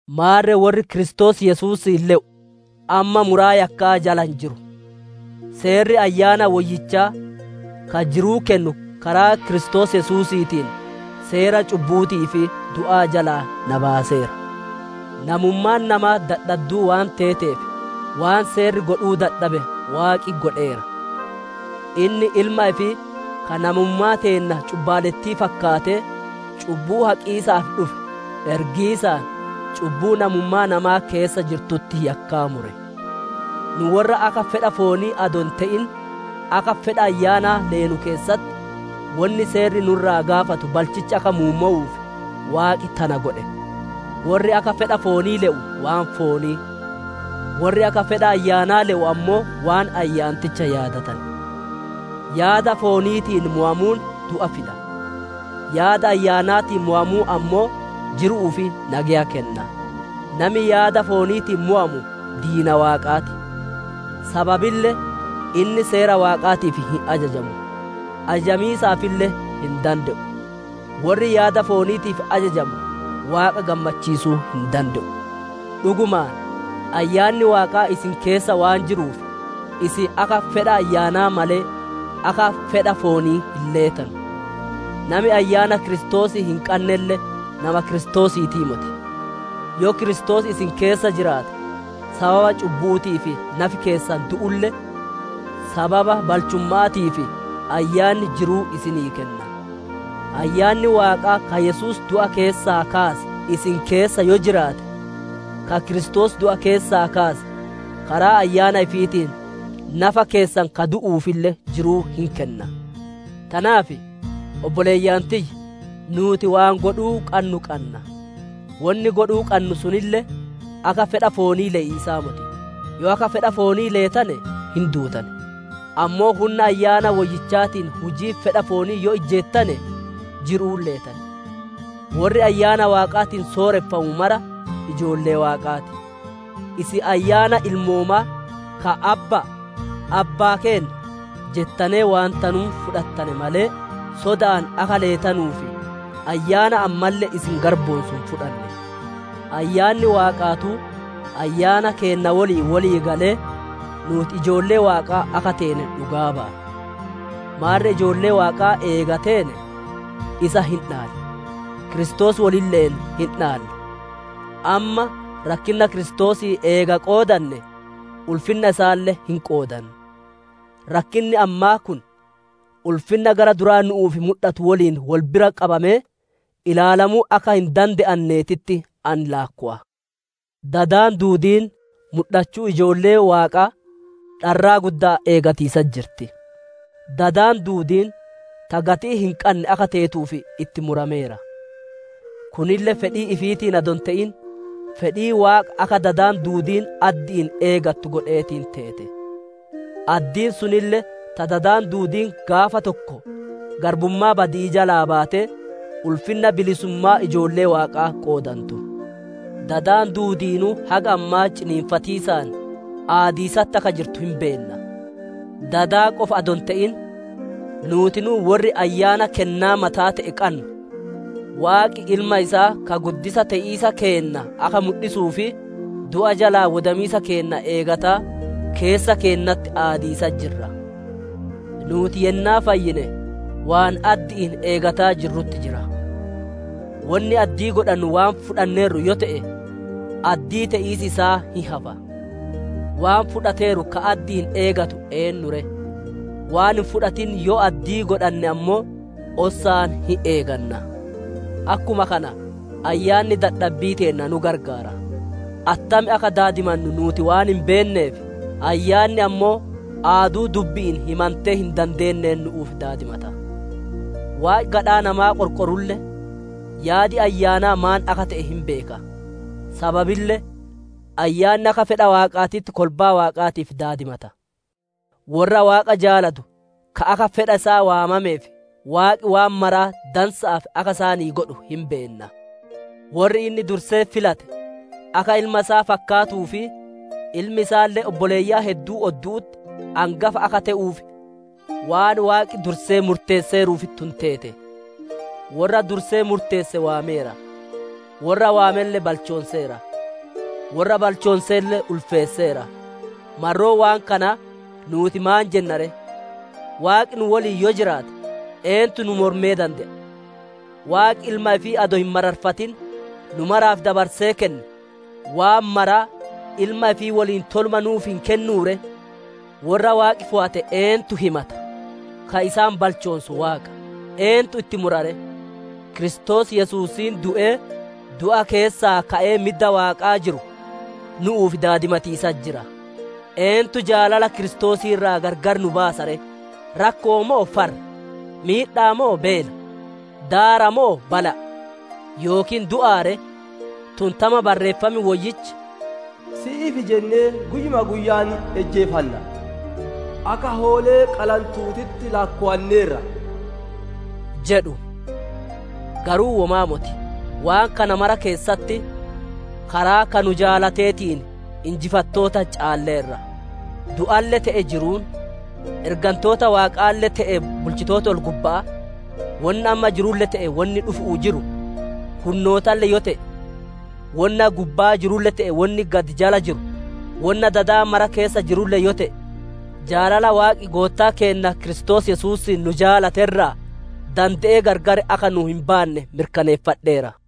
Maarre worri Kiristoos Yesuusiin le'u, amma muraa yakka'aa jala hin jiru. Seerri Ayyaana Woyyichaa, ka jiruu kennu karaa Kiristoos Yesuusiitiin, seera cubbu'uutii fi du'aa jalaa na baaseera. Namummaan namaa dadhadduu waan teeteef, waan Seerri godhuu dadhabe, Waaqi godheera. Inni Ilma ifii ka namummaa teenna cubbaalettii fakkaatee, cubbuu haqiisaaf dhufe, ergiisaan cubbuu namummaa namaa keessa jirtutti yakkaa mure. Nu worra akka fedha foonii adoo hin te'in, akka fedha Ayyaanaa leenu keessatti, wonni Seerri nu irraa gaafatu balchichi akka muummowuuf, Waaqi tana godhe. Worri akka fedha foonii le'u waan foonii, worri akka fedha Ayyaanaa le'u ammoo waan ayyaanticha yaadatan. Yaada fooniitiin mowamuun du'a fida; yaada Ayyaanaatiin mowamuun ammoo jiru'uu fi nageya kenna. Nami yaada fooniitiin mowamu diina Waaqaa ti; sababille inni Seera Waaqaatiif hin ajajamu; ajajamiisaafille hin dande'u. Worri yaada fooniitiif ajajamu Waaqa gammachiisuu hin dande'u. Dhugumaan, Ayyaanni Waaqaa isin keessa waan jiruuf, isin akka fedha Ayyaanaa malee, akka fedha foonii hin leetanu. Nami Ayyaana Kiristoosii hin qannelle nama Kiristoosiitii moti. Yoo Kiristoos isin keessa jiraate, sababa cubbu'uutiif nafi keessan du'ulle, sababa balchumma'aatiif Ayyaanni jiruu isinii kenna. Ayyaanni Waaqaa ka Yesuus du'a keessaa kaase, isin keessa yoo jiraate, ka Kiristoos du'a keessaa kaase, karaa Ayyaana ifiitiin nafa keessan ka du'uufille jiruu hin kenna. Tanaaf, obboleeyyan tiyya! Nuuti waan godhuu qannu qanna; wonni godhuu qannu sunille akka fedha foonii le'iisaa moti. Yoo akka fedha foonii leetane, hin duutan; ammoo hunna Ayyaana Woyyichaatiin hujii fedha foonii yoo ijjeettane jiru'uun leetan. Worri Ayyaana Waaqaatiin sooreffamu mara ijoollee Waaqaa ti. Isin Ayyaana ilmoomaa ka, «Abba'a! Abbaa keenna!» jettanee waantanuun fudhattane malee, soda'aan akka leetanuuf ayyaana ammalle isin garboonsu hin fudhanne. Ayyaanni Waaqaatuu ayyaana keenna woliin wolii galee, nuuti ijoollee Waaqaa akka teene dhugaa baya. Maarre ijoollee Waaqaa eega teene, isa hin dhaalla; Kiristoos wolille'een hin dhaalla; amma rakkinna Kiristoosii eega qoodanne, ulfinna isaalle hin qoodanna. Rakkinni ammaa kun ulfinna gara duraa nu'uuf mudhatu woliin wol bira qabamee ilaalamuu akka hin dande'annetti ani laakkowa. Dadi duudiin mudhachuu ijoollee Waaqaa dharraa gudda'aan eegiisatti jirti. Dadi duudiin ta gatii hin qanne akka teetuuf itti murameera; kunille fedhii ifiitiin adoo hin te'in, fedhii Waaqa akka dadi duudiin addi'iin eeggattu godheetiin teete. Addiin sunille ta dadi duudiin gaafa tokko garbummaa badi'ii jalaa baatee, ulfinna bilisummaa ijoollee Waaqaa qoodantu. Dadi duudiinuu haga ammaa ciniinsifatiisaan aadiisatti akka jirtu hin beenna. Dada qofa adoo hin te'in, nuutinuu worri Ayyaana kennaa mata'aa te'e qannu, Waaqi ilma isaa ka guddisaa te'iisa keenna akka mudhisuu fi du'a jalaa wodamiisa keenna eegataa, keessa keennatti aadiisatti jirra. Nuuti yennaa fayyine waan addi'iin eegataa jirrutti jira; wonni addii godhannu waan fudhanneerru yoo te'e, addii te'iisi isaa hin hafa. Waan fudhateeru ka addi'iin eegatu eennu ree? Waan hin fudhatin yoo addii godhanne ammoo, ossaan hin eeganna. Akkuma kana Ayyaanni dadhabbii teenna nu qarqaara; attam akka daadimannu nuuti waan hin beenneef, Ayyaanni ammoo aaduu dubbi'iin himantee hin dandeenneen nu'uuf daadimata. Waaqi gadhaa namaa qorqorulle, yaadi Ayyaanaa maan akka te'e hin beeka; sababille Ayyaanni akka fedha Waaqaatitti kolbaa Waaqaatiif daadimata. Worra Waaqa jaalatu ka akka fedha isaa waamameef, Waaqi waan maraa dansa'aaf akka isaanii godhu hin beenna. Worri inni dursee filate akka Ilma isaa fakkaatuu fi Ilmi isaalle obboleeyyan hedduu oddu'utti angafa akka te'uuf, waan Waaqi dursee murteesseeruuf tun teete. Worra dursee murteesse waameera; worra waamelle balchoonseera; worra balchoonselle ulfeesseera. Marroo waan kanaa, nuuti maan jenna ree? Waaqi nu woliin yoo jiraate, eentu nu mormee dande'a? Waaqi Ilma ifii adoo hin marariffatin, nu maraaf dabarsee kenne, waan mara Ilma ifii woliin toluma nuuf hin kennuu ree? Worra Waaqi fooyate eentu himata? Ka isaan balchoonsu Waaqa. Eentu itti mura ree? Kiristoos Yesuusiin du'ee, du'a keessaa ka'ee midda Waaqaa jiru, nu'uuf daadimatiisatti jira. Eentu jaalala Kiristoosii irraa gargar nu baasa ree? Rakko'oo moo farra? Miidha'a moo beela? Daara moo bala'a? Yookiin du'aa ree? Tun tama Barreeffam Woyyichi, «Si'iif jennee guyyuma guyya'aan ijjeefanna; akka hoolee qalantuutitti laakkowanneerra» jedhu. Garuu womaa moti; waan kana mara keessatti karaa ka nu jaalateetiin injifattoota caalleerra. Du'alle te'ee jiruun, ergantoota Waaqaalle te'ee bulchitooti ol-gubba'aa, wonna amma jirulle te'ee wonni dhufu'uuf jiru, hunnootalle yoo te'e, wonna gubbaa jirulle te'ee wonni gad jala jiru, wonna dada mara keessa jirulle yoo te'e, jaalala Waaqi Goottaa keenna Kiristoos Yesuusiin nu jaalate irraa dande'ee gargar akka nu hin baanne mirkaneeffadheera.